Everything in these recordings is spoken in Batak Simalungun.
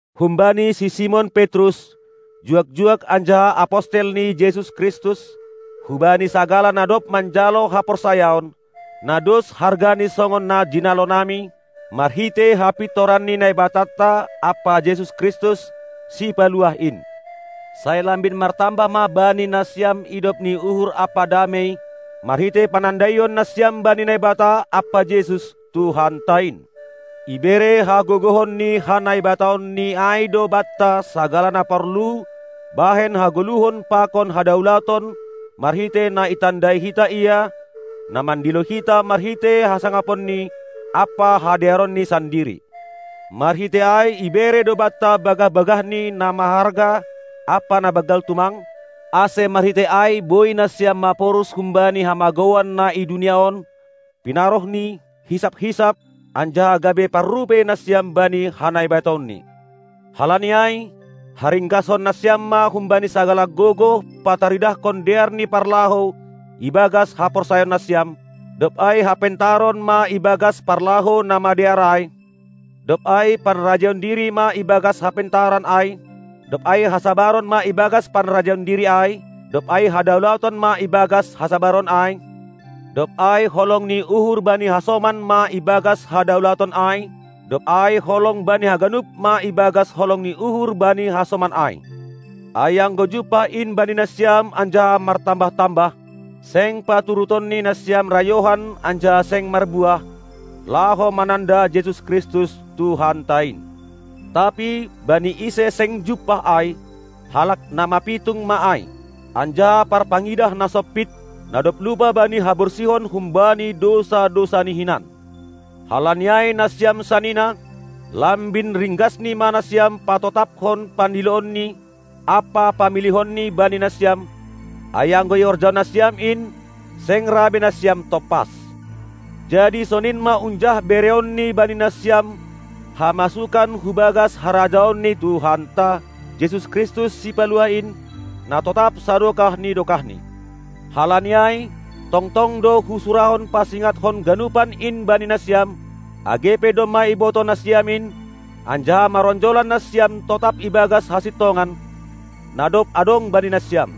Humbani si Simon Petrus, juak-juak anjaha apostel ni Jesus Kristus, hubani sagala na dob manjalo haporsayaon, na dos hargani songon na jinalonami, marhitei hapintoran ni Naibatanta ampa Jesus Kristus, Sipaluah in. Sai lambin martambah ma bani nasiam idop ni uhur ampa damei, marhitei panandaion nasiam bani Naibata ampa Jesus, Tuhanta in. Ibere hagogohon ni ha-NaibataonNi ai do banta sagala na porlu bahen hagoluhon pakon hadaulaton marhitei na itandai hita Ia, na mandilo hita marhitei hasangaponNi ampa hadearonNi sandiri. Marhitei ai ibere do banta bagah-bagahNi na maharga ampa na banggal tumang, ase marhitei ai boi nasiam maporus humbani hamagouan na i dunia on, pinaroh ni hisap-hisap, anjaha gabe parrupei nasiam bani ha-Naibataonni. Halani ai, haringgashon nasiam ma humbani sagala gogoh pataridahkon dear ni parlahou ibagas haporsayaon nasiam, dob ai hapentaron ma ibagas parlahou na madear ai; dob ai panrajaion diri ma ibagas hapentaron ai, dob ai hasabaron ma ibagas panrajaion diri ai, dob ai hadaulaton ma ibagas hasabaron ai; dob ai holong ni uhur bani hasoman ma ibagas hadaulaton ai, dob ai holong bani haganup ma ibagas holong ni uhur bani hasoman ai. Ai anggo jumpah in bani nasiam anjaha martambah-tambah, seng paturutonNi nasiam rayohan anjaha seng marbuah, laho mananda Jesus Kristus, Tuhanta in. Tapi, bani ise seng jumpah ai, halak na mapitung ma ai, anjaha parpangidah na sompit, na dob lupa bani haborsihon humbani dousa-dousani hinan. Halani ai, nasiam sanina, lambin ringgasni ma nasiam patotapkon pandiloonNi ampa pamilihonNi bani nasiam; ai anggo ihorjahon nasiam in, seng ra be nasiam tompas. Jadi sonin ma unjah bereonNi bani nasiam hamasukan hu bagas harajaon ni Tuhanta, Jesus Kristus Sipaluah in, na totap sadokah ni dokahni. Halani ai, tongtong do husurahon pasingathon ganupan in bani nasiam, age pe domma ibotoh nasiam in, anjaha maronjolan nasiam totap ibagas hasintongan, na dob adong bani nasiam.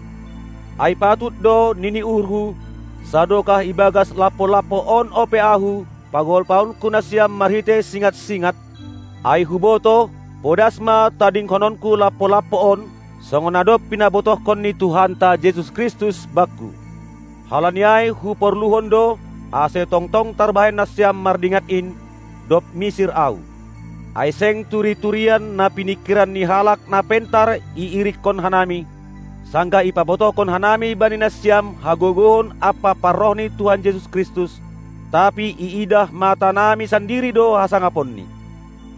Ai patut do, nini uhurhu, sadokah ibagas lampo-lampo on ope ahu, pagolpaonku nasiam marhitei singat-singat, ai hubotoh, podas ma tadinghononku lampo-lampo on, songon na dob pinabotohkon ni Tuhanta Jesus Kristus bakku. Halani ai huporluhon do, ase tongtong tarbahen nasiam mardingat in, dob misir ahu. Ai seng turi-turian na piningkiran ni halak na pentar iirikkon hanami, sanggah ipabotohkon hanami bani nasiam hagogohon ampa parroh ni Tuhan Jesus Kristus; tapi iidah matanami sandiri do hasangaponNi.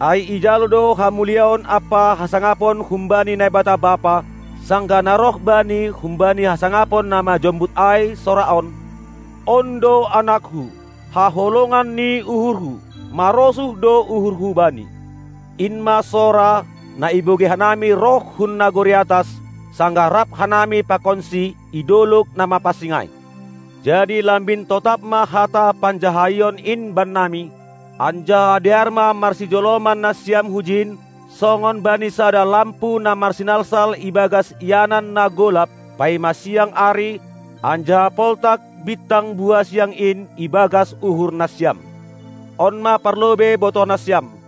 Ai ijalo do hamuliaon ampa hasangapon humbani Naibata Bapa, sanggah na roh Bani humbani hasangapon na majombut ai sora on: On do AnakKu, haholongan ni uhurHu; marosuh do uhurHu Bani. In ma sora, na ibogei hanami roh hun nagori atas, sanggah rap hanami pakonSi i dolog na mapansing ai. Jadi lambin totap ma hata panjahaion in bannami; anjaha dear ma marsijoloman nasiam hujin songon bani sada lampu na marsinalsal ibagas ianan na golap, paima siang ari, anjaha poltak bintang buha siang in ibagas uhur nasiam. On ma parlobei botoh nasiam: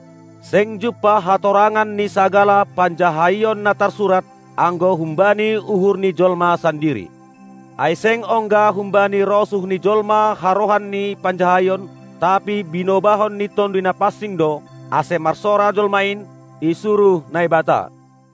Seng jumpah hatorangan ni sagala panjahaion na tarsurat, anggo humbani uhur ni jolma sandiri. Ai seng ongga humbani rosuh ni jolma harohan ni panjahaion; tapi binobahon ni Tonduy Napansing do, ase marsora jolma in, isuruh Naibata.